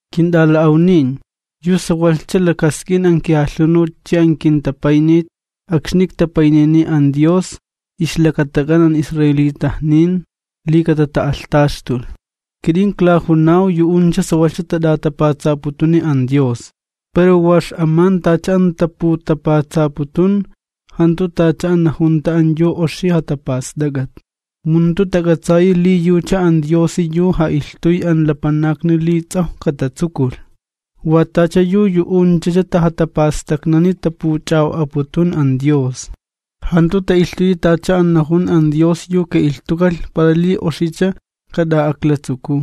Kint'ala'awnin, yu sawalhcha lakask'in an kijalhunut chi an kintapaynit akxni iktapaynini an Dios ixlakatak'an an israelitajnin, li katata'alhtaxtulh. Kit'in klajunaw, yu'uncha sawalhcha tat'atapatsaputuni an Dios pero wa x'aman tacha an taputapatsaputun jantu tacha an najunta an yu oxi jatapast'ak'at. Mu jantu tak'atsayi li yucha an Diosi yu ja'ilhtuy an lapanakni li ts'awj katatsukulh, wa tacha yu yu'unchacha tajatapastaknani tapuch'a'o'aputun an Dios, jantu ta'ilhtuyi tacha an najun an Dios yu ka'ilhtukalh para li oxicha kat'a klatsukuw.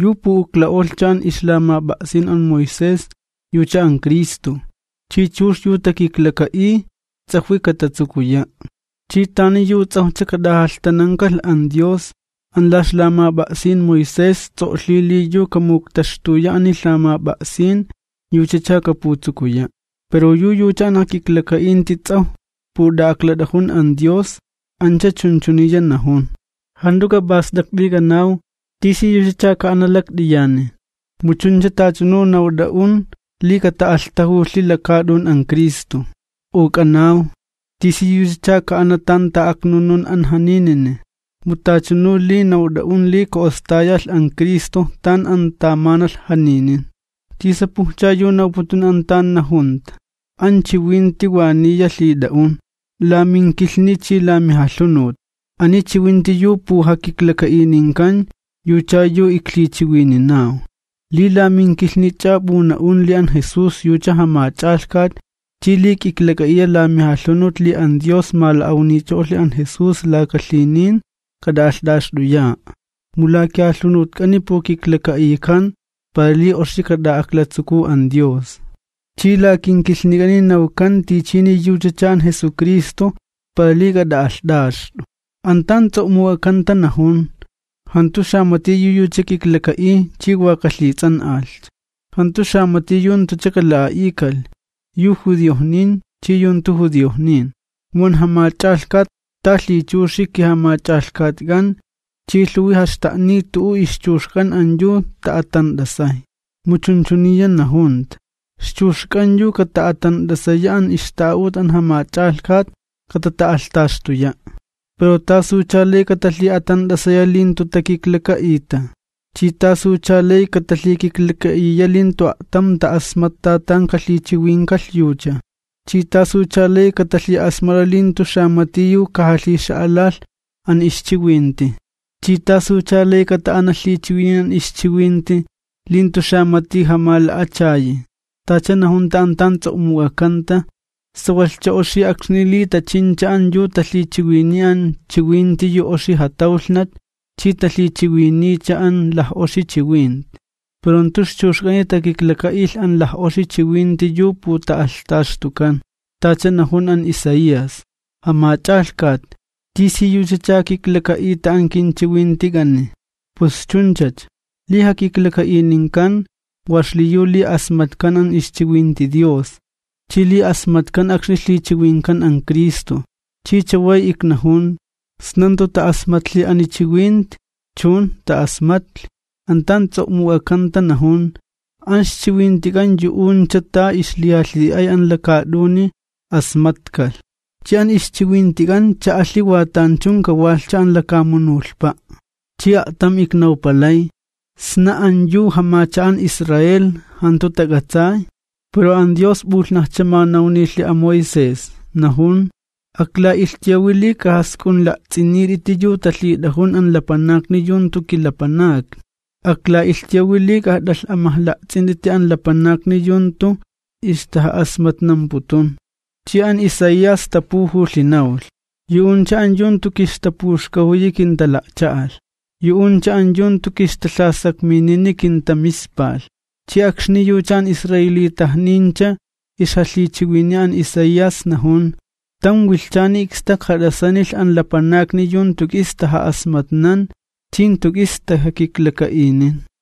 Yu pu'ukla'olhcha an ixlamap'a'sin an Moisés yucha an Cristo, chi chux yu takiklaka'iy ts'ajwi katatsukuya'. Chi tani yu ts'awjcha kat'ajalhtanankalh an Dios, an la ixlamap'a'sin Moisés ts'o'lhi: “Yu kamuktaxtuya ani lhamap'a'sin, yuchacha kaputsukuya'.” Pero yu yucha an jakiklaka'inti ts'awj put'a'aklat'ajun an Dios, ancha chunchuniya najun: “Jant'u k'ap'ast'akt'i k'anaw, ¿tisiyuchacha ka'ana lakt'iyani?” (mu chuncha tachanu nawt'a'un li kata'alhtajulhi lakaat'un an Cristo), u k'anaw, “¿Tisiyuchacha ka'ana tan ta'aknunun an janinini?” (mu tachanu li nawt'a'un li ka'ostayalh an Cristo tan an tamanalh janinin) ¿Tisapujcha yu nawputun an tan najunta?: “An chiwinti wa niya lhit'a'un, la minkilhni chi la mijalhunut.” Ani chiwinti yu pujakiklaka'ininkan yucha yu iklhichiwininaw. Li la minkilhnich'a p'una'un li an Jesús yucha Jamach'alhkat chi li k'iklak'a'iya la mijalhunut li an Dios mala'awnicho'olhi an Jesús laka lhinin, k'at'a'alht'axt'uya'a. Mu la kijalhunutk'ani pukiklaka'ikan para li oxi k'at'a'aklats'uk'u an Dios, chi la kinkilhnik'ani nawkan tichini yuchacha an Jesucristo para li k'at'a'alht'axt'u. An tan ts'o'muk'akanta najun: “Jantu xamati yu yucha kiklaka'iy chi wa kalhits'an'alhcha.” Jantu xamati yu jantucha kala'a'ikalh, yu judiojnin chi yu jantu judiojnin, mu an Jamach'alhkat, ta lhichuxi kiJamach'alhkatk'an chi lhuwi jaxta'niy t'u'u ixchuxk'an an yu ta'a'atant'asay. Mu chunchuniya najunta: “Ixchuxk'an yu kata'a'atant'asaya an ixta'a'ut an Jamach'alhkat, katata'alhtaxtuya'.” Pero, ¿tasucha lay katalhi'a'atant'asaya li jantu takiklaka'ita? ¿Chi tasucha lay katalhikiklaka'iya li jantu a'tam ta'asmatta tan kalhichiwinkalh yucha? ¿Chi tasucha lay katalhi'asmat'a li jantu xamati yu kajalhixa'alalh an ixchiwinti? ¿Chi tasucha lay kata'ana lhichiwinin an ixchiwinti li jantu xamati jamala'achayi? Tacha najunta an tan ts'o'muk'akanta: “¡Sawalhcha oxi akxni li tachincha an yu talhichiwiniy an chiwinti yu oxi jatawlhnat chi talhichiwiniycha an laj'oxi chiwinti!” Pero jantu ixchuxk'ani takiklaka'ilh an laj'oxi chiwinti yu puta'alhtaxtukan. Tacha najun an Isaías: “Jamach'alhkat, ¿tisiyuchacha kiklaka'ita an kinchiwintik'ani?” Pus chunchacha, li jakiklaka'ininkan wa xliyu li asmatkan an ixchiwinti Dios chi li asmatkan akxni lhichiwinkan an Cristo. Chi chaway iknajun: ¿Sna jantu ta'asmatlhi ani chiwinti? ¡Chun, ta'asmatlhi! An tan ts'o'muk'akanta najun: An ixchiwintik'an yu'uncha ta ixlijalhi'ay an lakaat'uni asmatkalh, chi an ixchiwintik'an cha'alhi wa tanchun kawalhcha an lakamunulhpa'. Chi a'tam iknawpalay: ¿Sna an yu jamacha'an Israel jantu tak'atsay? Pero an Dios p'ulhnajcha manawnilhi an Moisés, najun: Akla'ilhtuyawi li k'ajask'unla'ts'init'iti yu talhit'ajun an lapanakni yu jantu kilapanakni. Akla'ilhtuyawi li k'ajat'alh'amajla'ts'int'iti an lapanakni yu jantu ixtaja'asmatnamputun. Chi an Isaías tapujulhi nawlh: Yu'uncha an yu jantu kixtapuxkajuyi kintala'cha'alh. Yu'uncha an yu jantu kixtalhasakminini kintamispalh. Chi akxni yucha an israelitajnincha ixjalhichiwiniy an Isaías, najun: Tam wilhchani ikstak jat'asanilh an lapanakni yu jantu k'is taja'asmatnan chi jantu k'is tajakiklaka'inin.